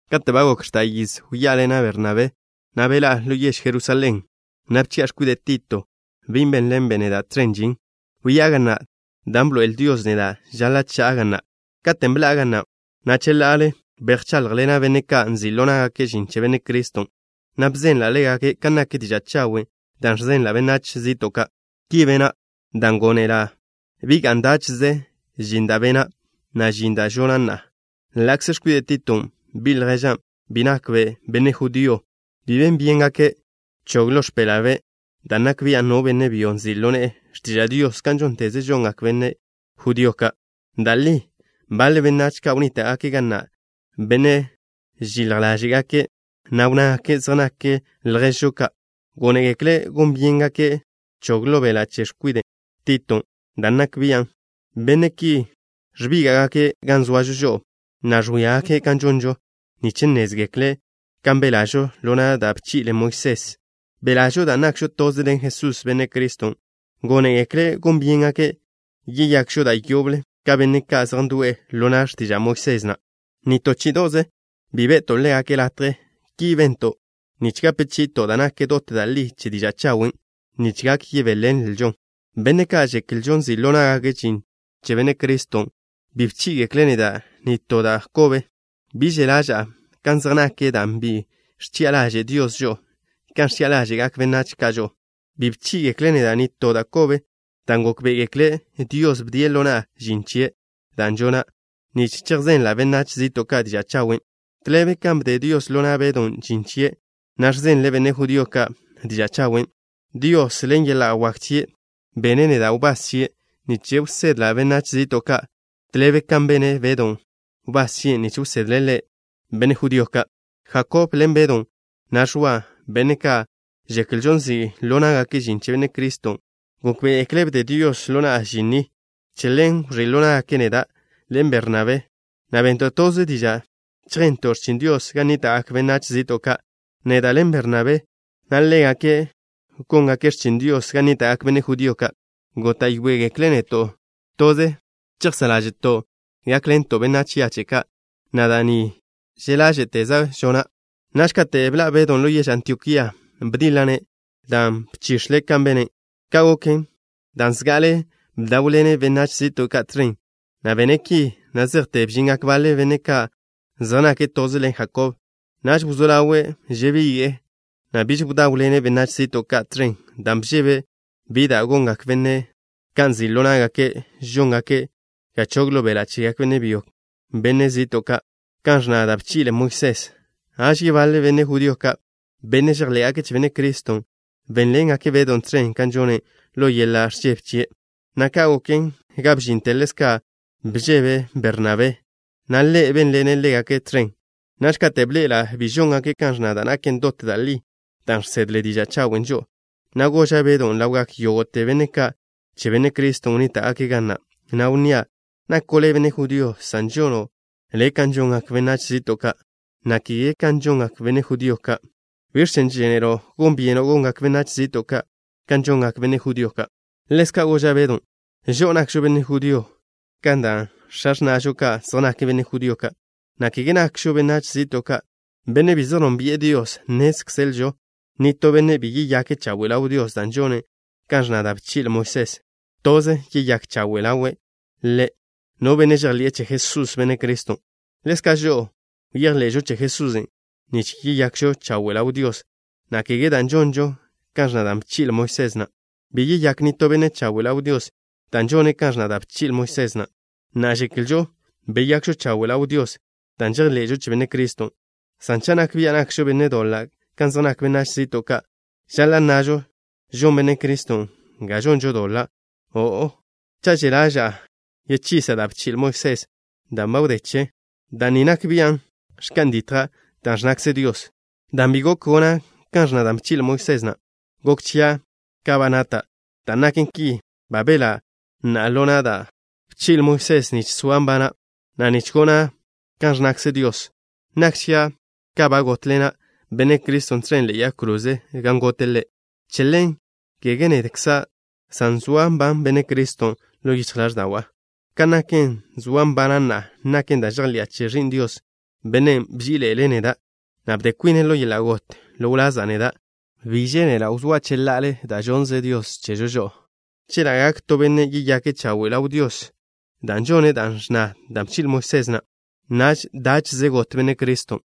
Kate' ba gok x̱da' yiz, wyá'aḻena' Bernabé, na' beḻá'a ḻo yež Jerusalén, na' bchi'a x̱kwide' Tito, bin' bénḻenbe' neda' tẕen žin. Wyá'a ga na' dan' bḻoe'el Dios neda' žaḻa' cha'a ga na'. Katen' bḻa'a ga na', na' cheḻa'ale bcháḻjḻena' benne' ka' nzi' ḻo ná'gake' žin che Benne' Criston', na' bzenla' ḻégake' kan nak diža' chawen' da' ẕzenla' benách zi'to' ka'. Ki bena' dan' gónela' bi ga'n dáche'ze žin da' ba bena', na' žin da' žona' na'a. Ḻa'kze x̱kwide' Titon', bi' lježan', bi nakbe' benne' judío, bi ben byéngake' chog ḻo x̱péḻa'be' dan' nak bian' no benne' byo nzi' ḻo ne'e x̱tiža' Dios kan žónteze žongak benne' judío ka'. Da' li, baḻe benách ka' wnníta'gake' ga na', benne' žilj ḻaže' ka', na' wnnágake' zej nake' lježžo ka', gónegekle' gon byéngake' chog ḻo beḻa' che x̱kwide' Titon' dan' nak bian'. Benne' ki ẕbíga'gake' gan zoažo žo'o, na' ẕwíagake' kan žonžo nich nnézgekle' kan belažo ḻo na' da' bchi'le Moisés. Belažo dan' nakžo toze ḻen Jesús, Benne' Criston'. Gónegekle' gon byéngake' yeyakžo da' yoble ka benne' ka' zej ndo'e ḻo na' x̱tiža' Moisés na'. Nitó chí'ido'ze, bi be'to' ḻégake' latje. Ki bento' nich gape chi'ito' da' nak dot da' li che diža' chawen' nich gak yebéḻenlžon. Benne' ka' žeklžo nzi' ḻo ná'gake' žin che Benne' Criston' bi bchí'igekle' neda' nitó da' kobe. Bi že' ḻaža'a kan zej nake', dan' bi ẕchi'a ḻaže' Dios žo'o kan ẕchi'a ḻáže'gak benách ka' žo'o. Bi bchí'igekle' neda' nitó da' kobe, dan' gókbe'egekle' Dios bdie' ḻo na'a žin chie' da' žona', nich chejzenla' benách zi'to' ka' diža' chawen', tḻebe kan bde Dios ḻo na' Bedon' žin chie', na' ẕzenle' benne' judío ka' diža' chawen'. Dios, ḻen yeḻa' wak chie', bene' neda' wbás chie' nich wsedla' benách zi'to' ka', tḻebe kan bene' Bedon' wbás chie' nich wsedle' ḻe' benne' judío ka'. Jakob ḻen Bedon', na' Ẕwa, benne' ka' žeklžo nzi' ḻo ná'gake' žin che Benne' Criston', gókbe'egekle' bde Dios ḻo na'a žin ni. Che ḻen wẕí' ḻo ná'gake' neda' ḻen Bernabé, na' bento' toze diža' chjento' x̱chin Dios gan nníta'gak benách zi'to' ka', neda' ḻen Bernabé, na' ḻégake' góngake' x̱chin Dios gan nníta'gak benne' judío ka'. Góta'yoegekle' neto' toze chejsá' ḻáže'to' gákḻento' benách yache' ka', na' da' ni že' ḻáže'teza' žona'. Naž kate' bḻa' Bedon' ḻo yež Antiokía, bdiḻa'-ne', dan' bchix̱le' kan bene'. Ka' goken dan' zga'ale bdáwḻene' benách zi'to' ka' tẕen, na' bene' ki na' zejte bžingak baḻe benne' ka' zej nake' toze ḻen Jakob. Naž wzó ḻawe' žebige'e, na' biž bdáwḻene' benách zi'to' ka' tẕen dan' bžebe' bi da' gongak benne' ka' nzi' ḻo ná'gake' žóngake' ga chog ḻo beḻa' chegak benne' byo, benne' zi'to' ka', kan ẕnna da' bchi'le Moisés. Naž yebaḻe benne' judío ka', benne' žejḻé'gake' che Benne' Criston', bénḻengake' Bedon' tẕen kan žone' ḻo yeḻa' ẕžebe chie', na' ka' goken ga bžinte ḻezka' bžebe Bernabé, na' ḻe' bénḻene' ḻégake' tẕen. Naž kate' bḻe'ela' bi žóngake' kan ẕnna da' naken dot da' ḻi da' žsedle diža' chawen' žo'o, na' goža' Bedon' ḻawgak yógo'te benne' ka' che Benne' Criston' wnníta'gake' ga na', na' wnnía': “Nako' le' benne' judío, san žono' le' kan žongak benách zi'to' ka', na' kege kan žongak benne' judío ka'. ¿Biẕ chen' žénelo' gon byeno' gongak benách zi'to' ka' kan žongak benne' judío ka'?” Ḻezka' goža' Bedon': “Žo'o nakžo benne' judío ka' dan' x̱a x̱na'žo ka' zej nake' benne' judío ka', na' kege nakžo benách zi'to' ka', benne' bi zej nónbi'e Dios. Nnézkzelžo nitó benne' bi yeyake' chawe' ḻaw Dios dan' žone' kan ẕnna da' bchi'le Moisés. Toze yeyák chawe' ḻawe' Ḻe' no benne' žejḻi'e che Jesús, Benne' Criston'. Ḻezka' žo'o bejḻe'žo che Jesusen', nich beyakžo chawe' ḻaw Dios, na' kege dan' žonžo kan ẕnna da' bchi'le Moisés na'. Bi yeyák nitó benne' chawe' ḻaw Dios dan' žone' kan ẕnna da' bchi'le Moisés na'. Na'a, žeklžo beyakžo chawe' ḻaw Dios dan' žejḻe'žo che Benne' Criston', san cha' nak bia' nakžo benne' doḻa' kan zej nak benách zi'to' ka', ¿žaḻa' nnažo žon Benne' Criston' ga žonžo doḻa'? O'o. Cha' že' ḻaža'a yechisa' da' bchi'le Moisés da' ba wdé chen, da' ni nak bian' ẕka'n ditja' da' ẕnnakze Dios.” Dan' bi gok gona' kan ẕnna da' bchi'le Moisés na', gok chia' ka ba nata'. Dan' naken ki, ba belá' na'a ḻo na' da' bchi'le Moisés nich soa' nbana', na' nich gona' kan ẕnnakze Dios. Nak chia' ka ba gótḻena' Benne' Criston' tẕen ḻe'e yag kroze gan gote' Ḻe'. Che ḻen kege nedkza' zoa' nbana', san zoa nban Benne' Criston' ḻo yichj ḻáẕda'wa'. Kan naken, zoa' nbana' na'a, naken dan' žejḻi'a che Ẕi'n Dios, Bennen' bží'iḻe'ele' neda', na' bde kwine' ḻo yeḻa' got ḻo wlaza' neda'. Bi žénela' wzóa' cheḻa'ale da' žonnze Dios chežo. Chela' gak to benne' yeyake' chawe' ḻaw Dios, dan' žone' da' ẕnna da' bchi'le Moisés na', naž dáche'ze got Benne' Criston'.